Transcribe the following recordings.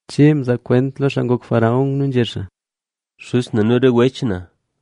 Che mzaa kwent lo xaa ngok faraón nu nzhé xaa: —Xuz na nu re wech na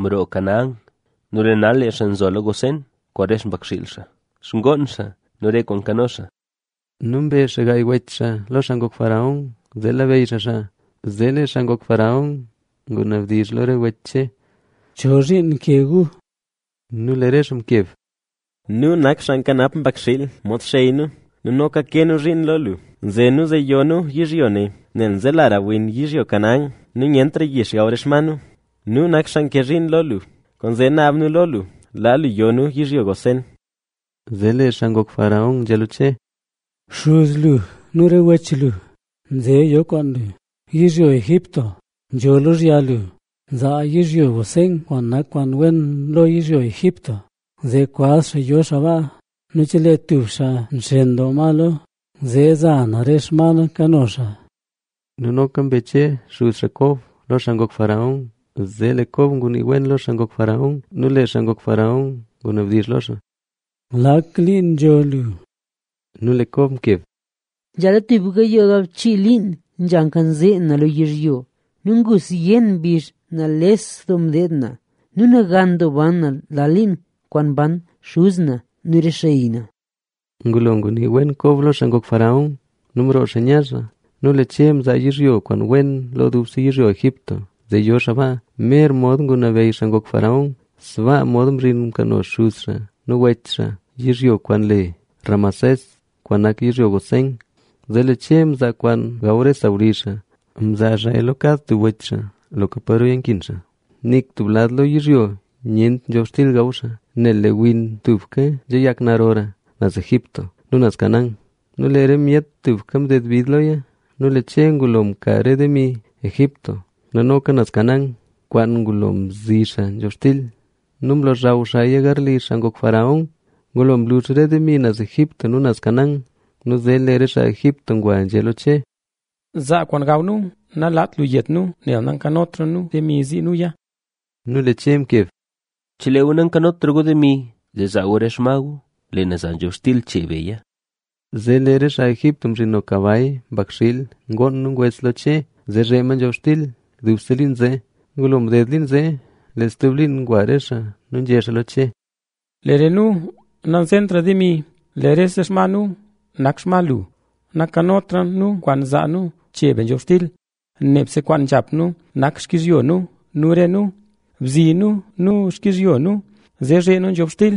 mroo Canaán nu lee nal lee xaa nzola Gosén kwaan re xpakxiil xaa, xkoon xaa nu re kwaan nkano xaa. Nu mbe xaa gaay wech xaa lo xaa ngok faraón, zee labeyy xaa xaa. Zee lee xaa ngok faraón ngunabdizh lo re wech Che: —¿Chozhiin nke gu? Nu lee re xaa mkeb: —Nu nak xaa nkanap mbakxiil, mod xey nu. Nu noka ke nu zhiin lo lu. Nze nu zee yo nu yizhyo ne, nel nzelara win yizhyo Canaán. Nu nyentra yix gaw re xma nu. Nu nak xaa ke zhiin lo lu, kwaanzee naab nu lo lu laa yo nu yizhyo Gosén. Zee lee xaa ngok faraón nzhé lo Che: —Xuz lu nu re wech lu nze yo kwaan lu. Yizhyo Egipto nzho lozhya lu. Zaa yizhyo Gosén kwaan nak kwaan wen lo yizhyo Egipto, zee kwaz xaa yo xaa baa. Nu chelee tub xaa nxen doo ma lo, zee za na re xma na kano xaa. Nu noka mbe Che xuz xaa Kob, lo xaa ngok faraón. Zee lee Kob ngunii wen lo xaa ngok faraón. Nu lee xaa ngok faraón ngunabdizh lo xaa: —¿Lak liin nzho lu? Nu lee Kob mkeb: —Nzhala tub gayoo galbchii liin nzha nkanzee na lo yizhyo. Nu ngu zyen mbizh nales doo mdeed na; nu nagan doo ban na lal liin kwaan mban xuz na nu re xey na. Ngulo ngunii wen Kob lo xaa ngok faraón nu mroo xaa nya xaa. Nu lee Che mzaa yizhyo kwaan wen lo dubse yizhyo Egipto, zee yo xaa baa, mer mod ngunabeyy xaa ngok faraón. Sbaa mod mzhin mkano xuz xaa nu wech xaa yizhyo kwaan le Ramesés kwaan nak yizhyo Gosén. Zee lee Che mzaa kwaan gaw re sawlizh xaa. Mzaa xaaya lo kad tub wech xaa loka paroya nkin xaa. Nik tub lad lo yizhyo nyent nzhobxtil gaw xaa, nel lee win tubka nzheyak narora naz Egipto nu naz Canaán. Nu lee re myet tubka mded bid loya. Nu lee Che ngulo mka re demi Egipto nu noka naz Canaán kwaan ngulo mzi xaa nzhobxtil. Nu mlozhaw xaaya garli xaa ngok faraón. Ngulo mlux re demi naz Egipto nu naz Canaán. Nu zee lee re xaa Egipto ngwa nzhé lo Che: —Zaa kwaan gaw nu. Nalaat lu yet nu, nel nakanotra nu demi zii nuya. Nu lee Che mkeb: —Chelee gu nankanotra gu demi, zee zaa gu re xma gu, lee na za nzhobxtil chee beya. Zee lee re xaa Egipto mzhino kabay, mbakxiil, ngoon nu ngwes lo Che, zee zhee ma nzhobxtil dubse liin zee. Ngulo mded liin zee, lee stub liin ngwa re xaa nu nzhé xaa lo Che: —Lee re nu nanzentra demi. Lee rese xma nu nakla xma lu. Nankanotra nu kwaan zaa nu chee be nzhobxtil, nebse kwaan nzhap nu nak xkizhyo nu nu re nu. Bzi nu nu xkizhyo nu, zee zhee nu nzhobxtil,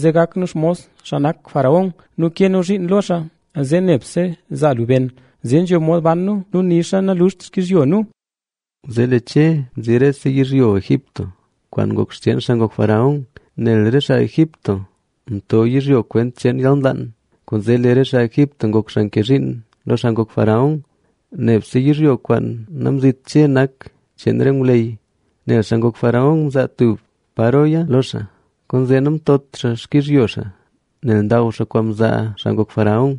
zee gak nu xmos xaa nak faraón. Nu ke nu zhiin lo xaa, zee nebse zaa lu ben, zee nzho mod ban nu nu nixa naluxt xkizhyo nu. Zee lee Che mzi rese yizhyo Egipto, kwaan ngok xcheen xaa ngok faraón. Nel re xaa Egipto mto yizhyo kwent cheen yalnlaan. Kwaanzee lee re xaa Egipto ngok xaa nke zhiin lo xaa ngok faraón. Nebse yizhyo kwaan namzit Che nak cheen re ngwleyy, nel xaa ngok faraón mzaa tub paroya lo xaa, kwaanzee namtot xaa xkizhyo xaa, nel ndaw xaa kwaan mzaa xaa ngok faraón.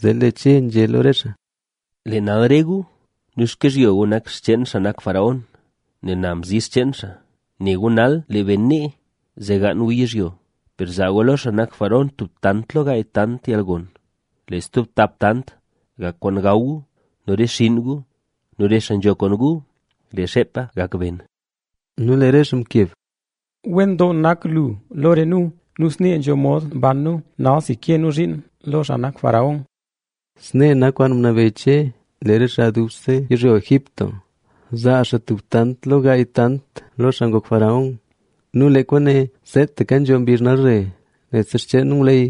Zee lee Che nzhé lo re xaa: —Lee nal re gu nu xkizhyo gu nak xcheen xaa nak faraón, nel na mzi xcheen xaa. Ne gu nal lee ben nee zee gaan gu yizhyo. Per zaa gu lo xaa nak faraón tub tant lo gaay tant yalgon. Lee stub tap tanta gak kwaan gaw gu nu re xinn gu nu re xaa nzho kwaan gu. Nu lee xeepa gak ben. Nu lee re xaa mkeb: —Wen doo nak lu lo re nu. Nu snee nzho mod ban nu, nalsi ke nu zhiin lo xaa nak faraón. Snee nak kwaan ngunabeyy Che le re xaa dubse yizhyo Egipto, zaa xaa tub tant lo gaay tant lo xaa ngok faraón. Nu lee kwaane seetaka nzho mbizh nalzhe. Nebse xcheen ngwleyy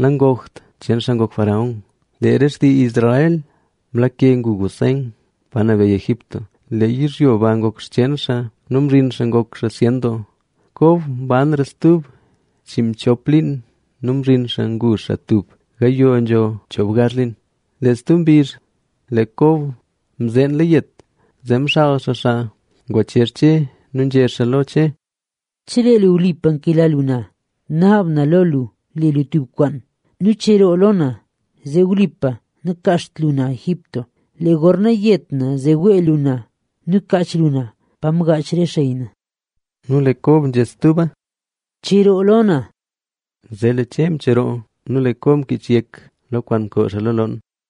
nangokt xcheen xaa ngok faraón. Lee re xtii Israel mlake ngu Gosén, pa nabeyy Egipto. Lee yizhyo ba ngok xcheen xaa nu mzhin xaa ngok xaa zyen doo. Kob mbanra stub chiinmchop liin nu mzhin xaa ngu xaa tub gayoo nzho choobgazh liin. Lee stub mbizh lee Kob mzeenla yet, zee mxaal xaa xaa ngwachezh Che nu nzhé xaa lo Che: —Chelee lu wlipa nkela lu na, naab na lo lu le lu tub kwaan nu cheroo lo na, zee wlipa nakaacht lu na Egipto. Lee gorna yet na, zee wee lu na nu kaach lu na pa mgaach re xey na. Nu lee Kob nzhé stuba: —¡Cheroo lo na! Zee lee Che mcheroo. Nu lee Kob mkich yek lo kwaan mkoo xaa lo loon.